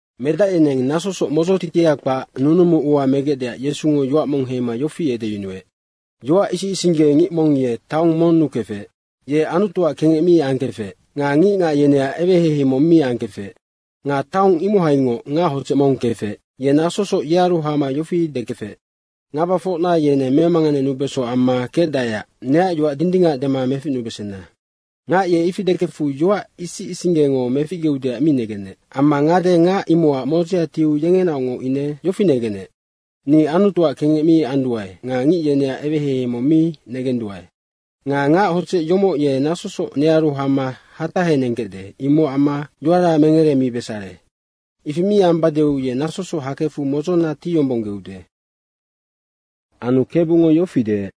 Medac yeneng nasosoc modzotitia kpac nunumu ua megecdeac Yesungo yoac mong heima yofi edeyunuec. “Yoac isic isingge ngic mong ye taong monnu kefec. Ye Anutuac kengec mi angkefec nga ngicngac yeneac eweheihei mong mi angkefec. Nga taong imohaingoc ngac hodzec mong kefec, ye nasosoc yearu hama yofi dekefec, ‘Ngabafocna yeneng memanganenubeso amma kecdaeac neac yoac dindingac dema meficnubesena.’ Ngac ye ifi dekefu yoac isic isinggengo meficgeudeac mi negenec. Amma ngade ngac imocac modzea tiu yengenaocngoc ine yofi negenec, ‘Ni Anutuac kengec mi anduae nga ngic yeneac eweheihei mong mi negenduae. Nga ngac hodzec yomoc ye nasosoc nearu hama hatahenengkecde, imocac amma yoara mengeremibesare. Ifi mi ambadeu ye nasosoc hakefu modzona tiyombonggeude.’” Anu Kebungo yofi deec,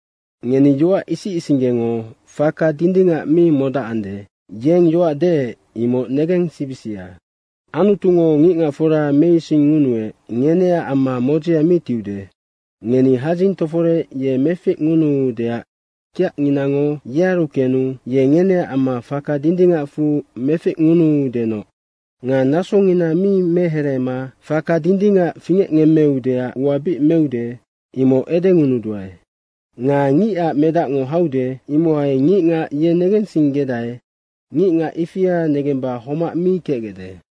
“Ngeni yoac isic isinggengo faka dindingac mi modacande, yeng yoac deec, imoc negensibisia. Anutungo ngicngacfora meisingngunuec, ngeneac amma modzea mi tiude. Ngeni hadzing toforec ye meficngunuudeac kiacnginango yearu kenu ye ngeneac amma faka dindingacfu meficngunuudenoc. Nga nasongina mi mehereema faka dindingac fingecngemmeudeac ua bic meude, imoc edengunuduae. Nga Ngicac Medacngo haude, imohai ngicngac ye negensinggedae, ngicngac ifia negemba homac kecgecde.”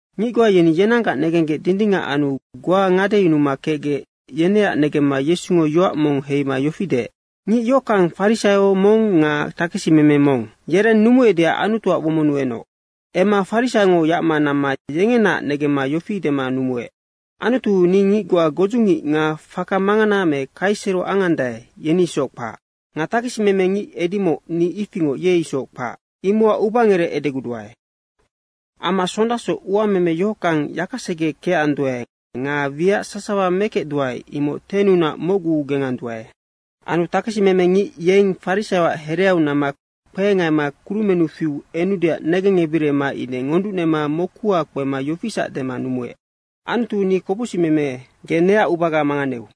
Ngic goa yeni yenanggac negenggec dindingac anu goa ngadeyunuma kecgec, yeneac negemma Yesungo yoac mong heima yofi deec, “Ngic yohockang, farisaio mong nga takesimeme mong, yereng numuecdeac Anutuac womonnu enoc. Emma farisaiongo yacma namma yengenaac negemma yofi dema numuec, ‘Anutu ni ngic goa, godzungic nga faka mangana me kaisero angandae, yeni isoc kpac. Nga takesimeme ngic edimoc, ni ifingoc ye isoc kpac, imocac ubangerec edeguduae. Amma sondasoc uameme yohockang yakasege kecanduae nga wiac sasawa mekecduae, imoc 10nunac mocgu genganduae.’ Anu takesimeme ngic yeng farisaioac hereau namma kpehengaima kurumennu fiu enudeac negengebirima ine ngonducnema mokuhau kpema yofisac dema numuec, ‘Anutu, ni kopocsicmeme, ge neac ubaga manganeu.’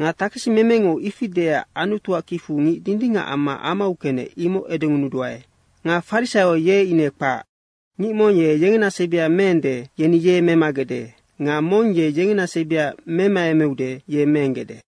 Nga takesimemengo ifi deecac Anutuac kicfu ngic dindingac amma amau kenec, imoc edengunuduae. Nga farisaio ye ine kpac. Ngic mong ye yengena sebi meende, yeni ye memagecde nga mong ye yengena sebi memaemeude, ye meenggecde.”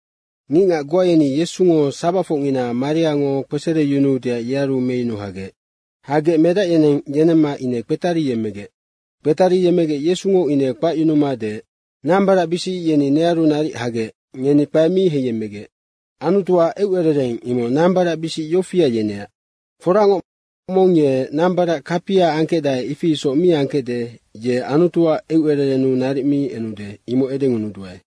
Ngicngac goa yeni Yesungo sabacfocngina mariango kpesereyunuudeac yearu meyunu hagec. Hagec medac yeneng yenemma ine kpetariyemmegec. Kpetariyemmegec Yesungo ine kpacyunuma deec, “Nambaracbisic yeni nearu naric hagec, ngeni kpae mi heiyemmegec. Anutuac eucerereng imoc nambaracbisic yofia yeneac. Foracngoc, mong ye nambarac kapia angkecdae, ifi isoc mi angkecde, ye Anutuac eucererennu naric mi enude, imoc edengunuduae.”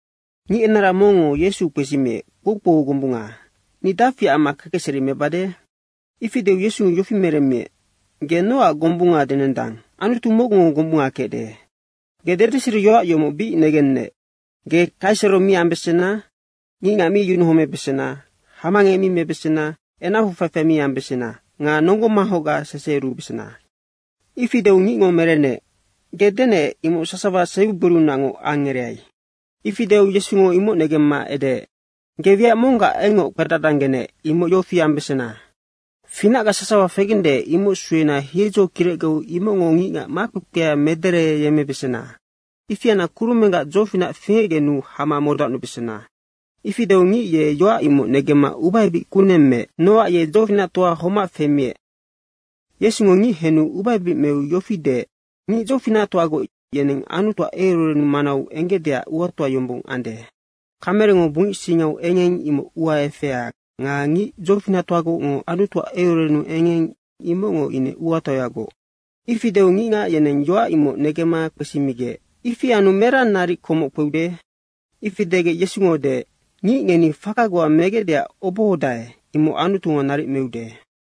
Ngic enara mongngo Yesu kpesimiec, “Kpoukpou gombunga, ni dafi amma kekecseri mebade?” Ifi deu Yesungo yofi meremmiec, “Ge nocac gombunga denendang? Anutu mocgungo gombunga kecde. Ge dedeseriyoac yomoc bic negennec, ‘Ge kaisero mi ambesena, ngicngac mi yunuhomebesena, hamangec mi mebesena, enacfu faifai mi ambesena nga nonggo manghocga seseheyurubesena.’” Ifi deu ngicngo merenec, “Ge denec, imoc sasawa sebigborinaungoc angereai.” Ifi deu Yesungo imoc negemma edeec, “Ge wiac monggac engngoc kpedadanggenec, imoc yofi ambesena. Finacga sasawa fegende, imoc suena hiedzo kirecgeu imocngo ngicngac makpekpea medereyemmebesena. Ifi anna kurumenggac dzofinac fingecgenu hama modacnubesena.” Ifi deu ngic ye yoac imoc negemma ubaebic kuneng meec, nocac ye dzofinactoa homac femiec. Yesungo ngic henu ubaebic meu yofi deec, “Ngic dzofinactoagoc yeneng Anutuac eucerereng manau enggecdeac uatoa yombong ande. Kamerengo bungic singau engeng imoc ua efea nga ngic dzofinactoagocngo Anutuac eucererennu engeng, imocngo ine uatoayagoc.” Ifi deu ngicngac yeneng yoac imoc negemma kpesimigec, “Ifi anu merang naric komoc kpeude?” Ifi degec Yesungo deec, “Ngic ngeni faka goa megecdeac obohodae, imoc Anutungo naric meude.”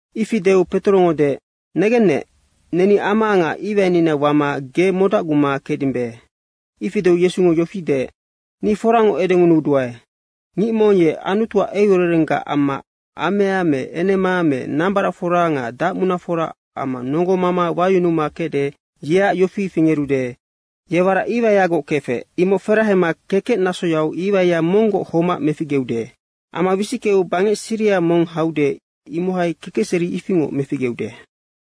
Ifi deu Petorongo deec, “Negennec, neni ama nga iwainina wama ge modacguma kecdimbe.” Ifi deu Yesungo yofi deec, “Ni foracngoc edengunuduae, ngic mong ye Anutuac eucererenggac amma amea me enema me nambaracfora nga dacmunafora amma nonggomama wayunuma kecde, yeac yofi fingerude, ye warac iwaiagoc kefec, imoc ferahema kekec nasoyau iwaia monggoc homac meficgeude. Amma wisickeu bangec siriha mong haude, imohai kekecseri ifingoc meficgeude.”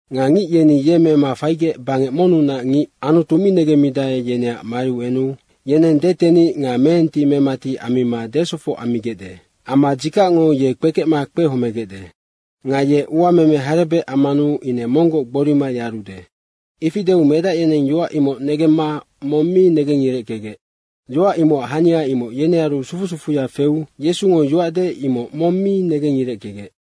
Nga ngic yeni ye mema faigec bangec monnunac ngic Anutu mi negemmidae, yeneac mariu enu yeneng detenic nga meenti memati ammima desofoc ammigecde. Amma dzikacngo ye kpekecma kpehomegecde. Nga ye uameme harebec ammanu ine monggoc gborima yarude.” Ifi deu medac yeneng yoac imoc negemma mong mi negengireckegec. Yoac imocac hania imoc yenearu sufu sufuya feu Yesungo yoac deec, imoc mong mi negengireckegec.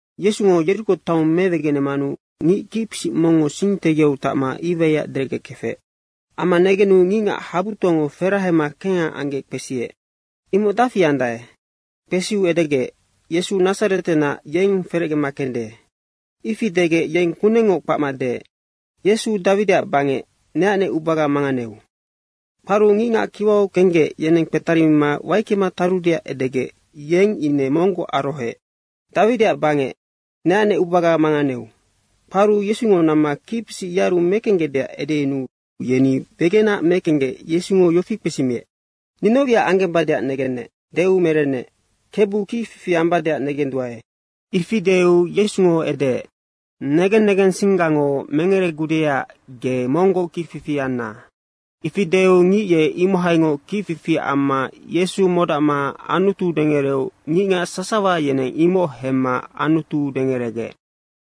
Yesungo Yeriko taong mewegenemanu ngic kicpisic mongngo sing tegiau tacma iwaiac derecgekefec. Amma negenu ngicngac habutoango ferahema kengha anggec kpesiec, “Imoc dafi andae?” Kpesiu edegec, “Yesu Nadzaretenac, yeng ferecgema kende.” Ifi degec yeng kunengngoc kpacma deec, “Yesu Dawidiac bangec, neacnec ubaga manganeu.” Kparu ngicngac kiwau kenggec, yeneng kpetarimima waickema tarudeac edegec yeng ine monggoc arohoec, “Dawidiac bangec, neacnec ubaga manganeu.” Kparu Yesungo namma kicpisic yearu mekenggecdeac edeyunuu yeni wegenac mekenggec Yesungo yofi kpesimiec, “Ni noc wiac anggembadeac negennec?” deu merenec, “Kebu, kicfifi ambadeac negenduae.” Ifi deu Yesungo edeec, “Negen negensinggango mengeregudeac, ge monggoc kicfifi anna.” ifi deu ngic ye imohaingoc kicfifi amma Yesu modacma Anutu dengereu ngicngac sasawa yeneng imoc hemma Anutu dengeregec.